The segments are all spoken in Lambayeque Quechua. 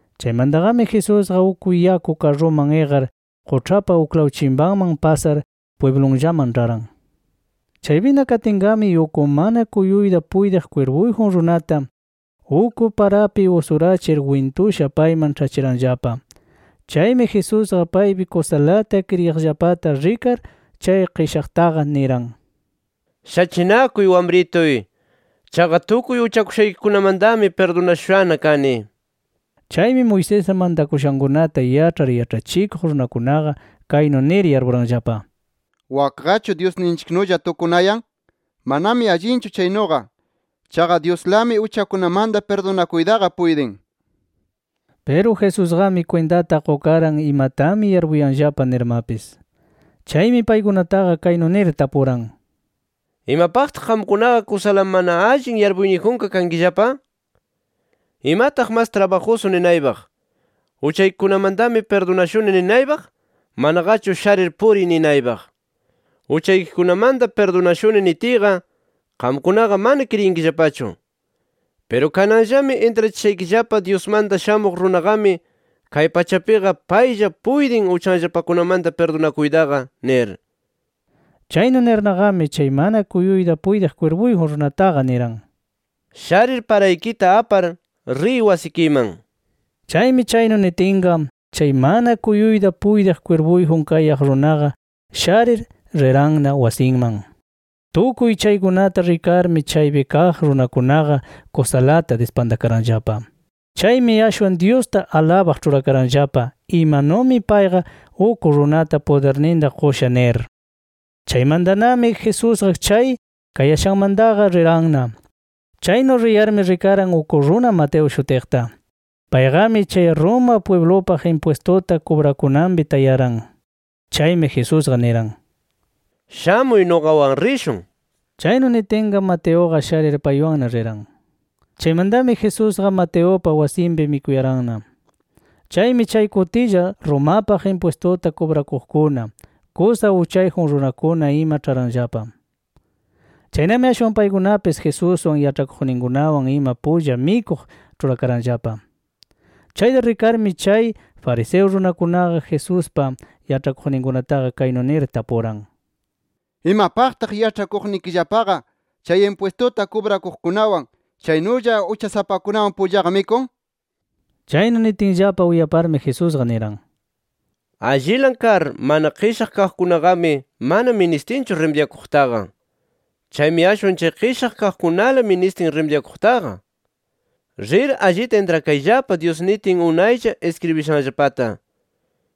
Chaymantaqami Jesusqa uk yaku karruman iqar, quĉhapa uklaw chimpanman pasar pwiblunllaman ĉharan. Chaypina katinqami uk mana kuyuyta puytiq kwirpuyjun runata, uk parapi usurachir wintusha payman ĉhachiranllapa. Chaymi Jesusqa paypi kusalata kriyiqllapata rikar, chay qishaqtaqa niran: —Shachinakuy wamrituy. Chaqa tukuy uchakushaykikunamantami pirdunashushana kani nir. Chaymi Moisés mantakushankunata yaĉhar yaĉhachikuq runakunaqa kaynu nir yarpuranllapa: ¿Wakqachu Dyusninchiknulla tukunayan? Manami allinchu chaynuqa. Chaqa Dyuslami uchakunamanta pirdunakuytaqa puytin nir. Piru Jesusqami kwintata qukaran imatami yarpuyanllapa nirmapis. Chaymi paykunataqa kaynu nir tapuran: —¿Imapaqtaq qamkunaqa kusala mana allin yarpuyniyjunqa kankillapa? ¿Imataq mas trabajusu ninaypaq, ‘Uchaykikunamantami pirdunashuni’ ninaypaq, manaqachu ‘Sharir puriy’ ninaypaq? ‘Uchaykikunamanta pirdunashuni’ nitiyqa qamkunaqa mana kriyinkillapachu. Piru kananllami intrachishaykillapa Dyusmanta Shamuq Runaqami kay pachapiqa paylla puytin uchanllapakunamanta pirdunakuytaqa nir. Chaynu nirnaqami chay mana kuyuyta puytiq kwirpuyjun runataqa niran: —Sharir paraykita apar, riy wasikiman nir. Chaymi chaynu nitinqa, chay mana kuyuyta puytiq kwirpuyjun kayaq runaqa sharir, riranna wasinman. Tukuy chaykunata rikarmi chaypi kaq runakunaqa kusalata dispantakaranllapa. Chaymi ashwan Dyusta alabaq ĉhurakaranllapa imanumi payqa uk runata pudirninta qusha nir. Chaymantami Jesusqa chay kayashanmantaqa riranna. Chaynu riyarmi rikaran uk runa Mateo shutiqta. Payqami chay Roma pwiblupaq impwistuta kubrakunanpi tayaran. Chaymi Jesusqa niran: —Shamuy nuqawan rishun nir. Chaynu nitinqa Mateuqa sharir paywanna riran. Chaymantami Jesusqa Mateupa wasinpi mikuyaranna. Chaymi chay kutilla Romapaq impwistuta kubrakuqkuna, kusa uchayjun runakuna ima ĉharanllapa. Chaynami ashwan paykunapis Jesuswan, yaĉhakuqninkunawan ima pulla mikuq ĉhurakaranllapa. Chayta rikarmi chay fariseo runakunaqa Jesuspa yaĉhakuqninkunataqa kaynu nir tapuran: —¿Imapaqtaq yaĉhachikuqnikillapaqa chay impwistuta kubrakuqkunawan chaynulla uchasapakunawan pullaqa mikun? nir. Chaynu nitinllapa uyaparmi, Jesusqa niran: —Allilan kar mana qishaq kaqkunaqami mana ministinchu rimidyakuqtaqa. Chaymi ashwan chay qishaq kaqkunala ministin rimidyakuqtaqa. Rir allita intrakayllapa Dyus nitin unaylla iskribishanllapata.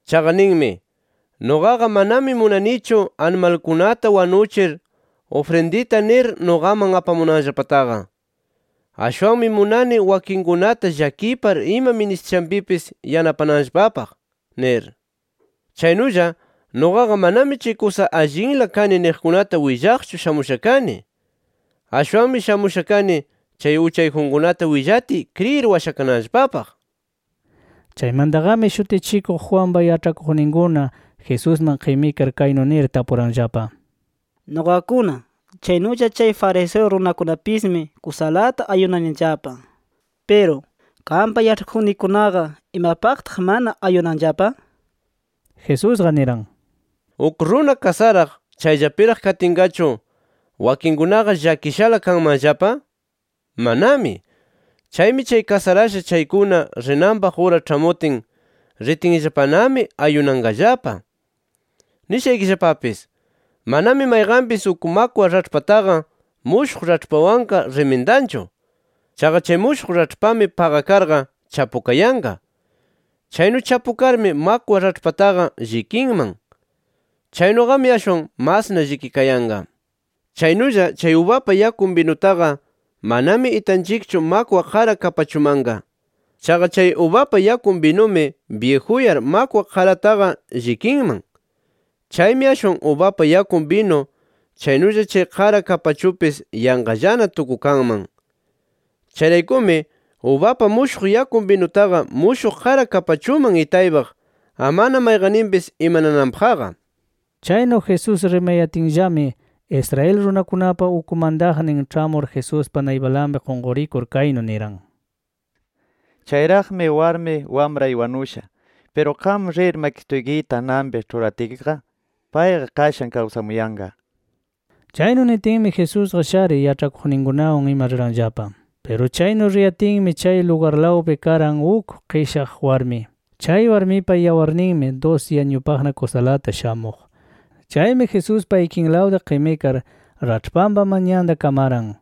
Chaqa ninmi: ‘Nuqaqa manami munanichu animalkunata wanuchir ufrindita nir nuqaman apamunanllapataqa. Ashwanmi munani wakinkunata llakipar ima ministishanpipis yanapananllapapaq’ nir. Chaynulla nuqaqa manami chay kusa allinla kani niqkunata willaqchu shamusha kani. Ashwanmi shamusha kani, chay uchayjunkunata willatiy kriyir washakananllapapaq. Chaymantaqami Shutichikuq Juanpa yaĉhakuqninkuna, Jesusman qimikar kaynu nir tapuranllapa: —Nuqakuna, chaynulla chay fariseo runakunapismi kusalata ayunanillapa. Piru qampa yaĉhakuqnikikunaqa ¿imapaqtaq mana ayunanllapa? nir. Jesusqa niran: —¿Uk runa kasaraq, chayllapiraq katinqachu, wakinkunaqa llakishala kanmanllapa? ¡Manami! Chaymi chay kasarasha chaykuna rinanpaq ura ĉhamutin, ritinllapanami ayunanqallapa. “Nishaykillapapis: Manami mayqanpis uk makwa raĉhpataqa mushuq raĉhpawanqa rimindanchu. Chaqa chay mushuq raĉhpami paqakarqa chapukayanqa. Chaynu chapukarmi, makwa raĉhpataqa llikinman. Chaynuqami ashwan masna llikikayanqa. Chaynulla, chay ubapa yakun binutaqa manami itanchikchu makwa qara kapachumanqa. Chaqa chay ubapa yakun binumi byijuyar makwa qarataqa llikinman. Chaymi ashwan ubapa yakun binu chaynulla chay qara kapachupis yanqallana tukukanman. Chayraykumi, ubapa mushuq yakun binutaqa mushuq qara kapachuman itaypaq amana mayqanninpis imanananpaqqa”. Chaynu Jesús rimayatinllami, Israel runakunapa uk mantaqnin ĉhamur Jesuspa naypanlapi qunqurikur kaynu niran: —Chayraqmi warmi wamray wanusha. Piru qam rir makisituykita ananpi ĉhuratkiqa, payqa qashan kawsamuyanqa nir. Chaynu nitinmi Jesusqa sharir, yaĉhakuqninkunawan ima riranllapa. Piru chaynu riyatinmi chay lugarlawpi karan uk qishaq warmi. Chay warmipa yawarninmi dusi añupaqna kusalata shamuq. Chaymi Jesuspa ikinlawta qimikar raĉhpanpa manyanta kamaran.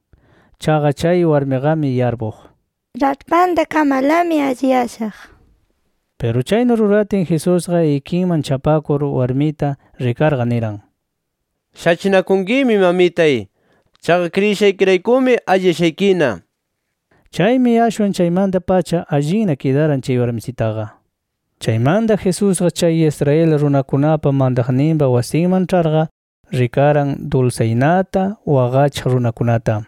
Chaqa chay warmiqami yarpuq, raĉhpanta kamarlami alliyashaq nir. Piru chaynu ruratin Jesusqa ikiman chapakur warmita rikarqa niran: —Shachinakunkimi mamitay. Chaqa kriyishaykiraykumi alliyashaykina. Chaymi ashwan chaymanta-pacha allinna kidaran chay warmisitaqa. Chaymanta Jesusqa chay Israel runakunapa mantaqninpa wasinman ĉharqa, rikaran dulsaynata waqachiq runakunata.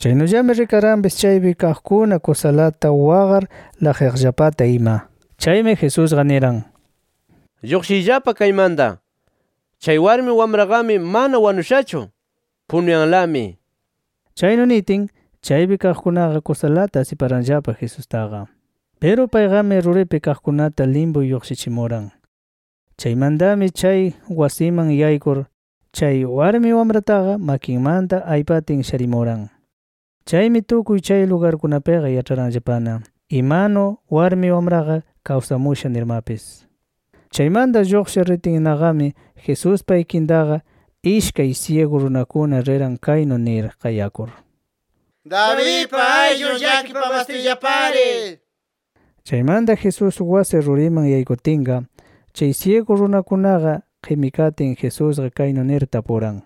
Chaynullami rikaranpis chaypi kaqkuna kusalata waqar laqyaqllapata ima. Chaymi Jesusqa niran: —Lluqshiyllapa kaymanta. Chay warmi wamraqami mana wanushachu. Punuyanlami nir. Chaynu nitin, chaypi kaqkunaqa kusalata asiparanllapa Jesustaqa. Piru payqami ruripi kaqkunata limpu lluqshichimuran. Chaymantami chay wasiman yaykur, chay warmi wamrataqa makinmanta aypatin, sharimuran. Chaymi tukuy chay lugarkunapiqa yaĉharanllapana imanu warmi wamraqa kawsamusha nirmapis. Chaymanta lluqshir ritinnaqami Jesuspa ikintaqa ishkay syigu runakuna riran kaynu nir qayakur: —¡Davidpa ayllun llakipamastuyllapari! nir. Chaymanta Jesús wasi ruriman yaykutinqa, chay syigu runakunaqa qimikatin, Jesusqa kaynu nir tapuran: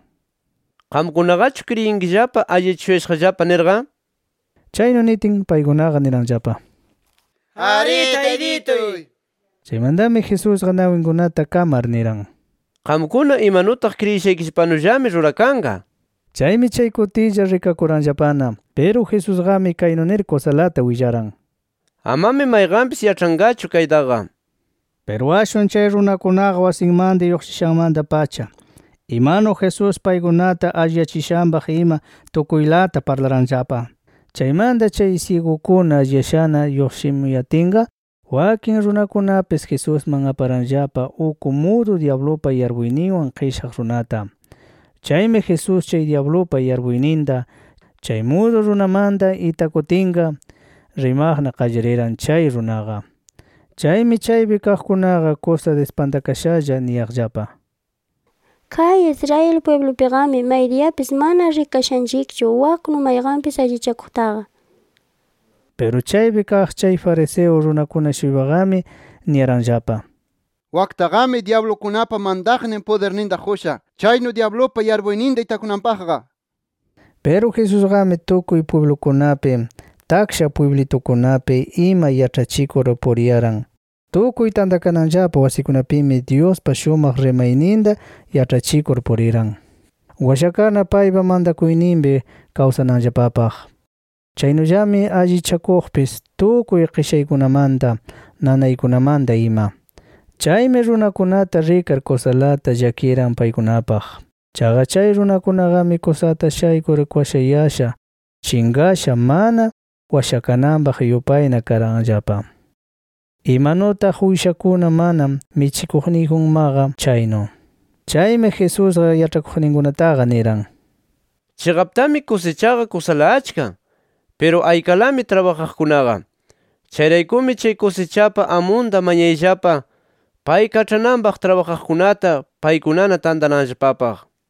—¿Qamkunaqachu kriyinkillapa alliyachishuyashaqllapa nirqa? Chaynu nitin, paykunaqa niranllapa: —Arí taytituy nir. Chaymantami Jesusqa, nawinkunata kamar niran: —Qamkuna imanutaq kriyishaykillapanullami rurakanqa nir. Chaymi chay kutilla rikakuranllapana. Piru Jesusqami kaynu nir kusalata willaran: —Amami mayqanpis yaĉhanqachu kaytaqa nir. Piru ashwan chay runakunaqa wasimanta lluqshishanmanta-pacha imanu Jesús paykunata alliyachishanpaq ima tukuylata parlaranllapa. Chaymanta chay syigukuna alliyashana lluqshimuyatinqa, wakin runakunapis Jesusman aparanllapa uk mudu dyablupa yarpuyninwan qishaq runata. Chaymi Jesús chay dyablupa yarpuyninta chay mudu runamanta itakutinqa, rimaqna qallariran chay runaqa. Chaymi chaypi kaqkunaqa kusa dispantakashalla niyaqllapa: “¡Kay Israel pwiblupiqami maydiyapis mana rikashanchikchu waknu mayqanpis allichakuqtaqa!” nir. Piru chaypi kaq chay fariseo runakuna-shuypaqami niyaranllapa: “Waktaqami dyablukunapa mantaqnin pudirninta qusha, chaynu dyablupa yarpuyninta itakunanpaqqa” nir. Piru Jesusqami tukuy pwiblukunapi, taksha pwiblitukunapi ima yaĉhachikur puriyaran. Tukuy tantakananllapa wasikunapimi Dyuspa shumaq rimayninta yaĉhachikur puriran, washakarna paypa mantakuyninpi kawsananllapapaq. Chaynullami allichakuqpis tukuy qishaykunamanta, nanaykunamanta ima. Chaymi runakunata rikar, kusalata llakiran paykunapaq. Chaqa chay runakunaqami kusata shaykur kwashayasha, chinqasha mana washakananpaq yupayna karanllapa, imanutaq uyshakuna mana michikuqniyjunmaqa chaynu. Chaymi Jesusqa yaĉhakuqninkunataqa niran: “Chiqaptami kusichaqa kusala achka. Piru aykalami trabajaqkunaqa. Chayraykumi chay kusichapa amunta mañayllapa, pay kaĉhananpaq trabajaqkunata, paykunana tantananllapapaq” nir.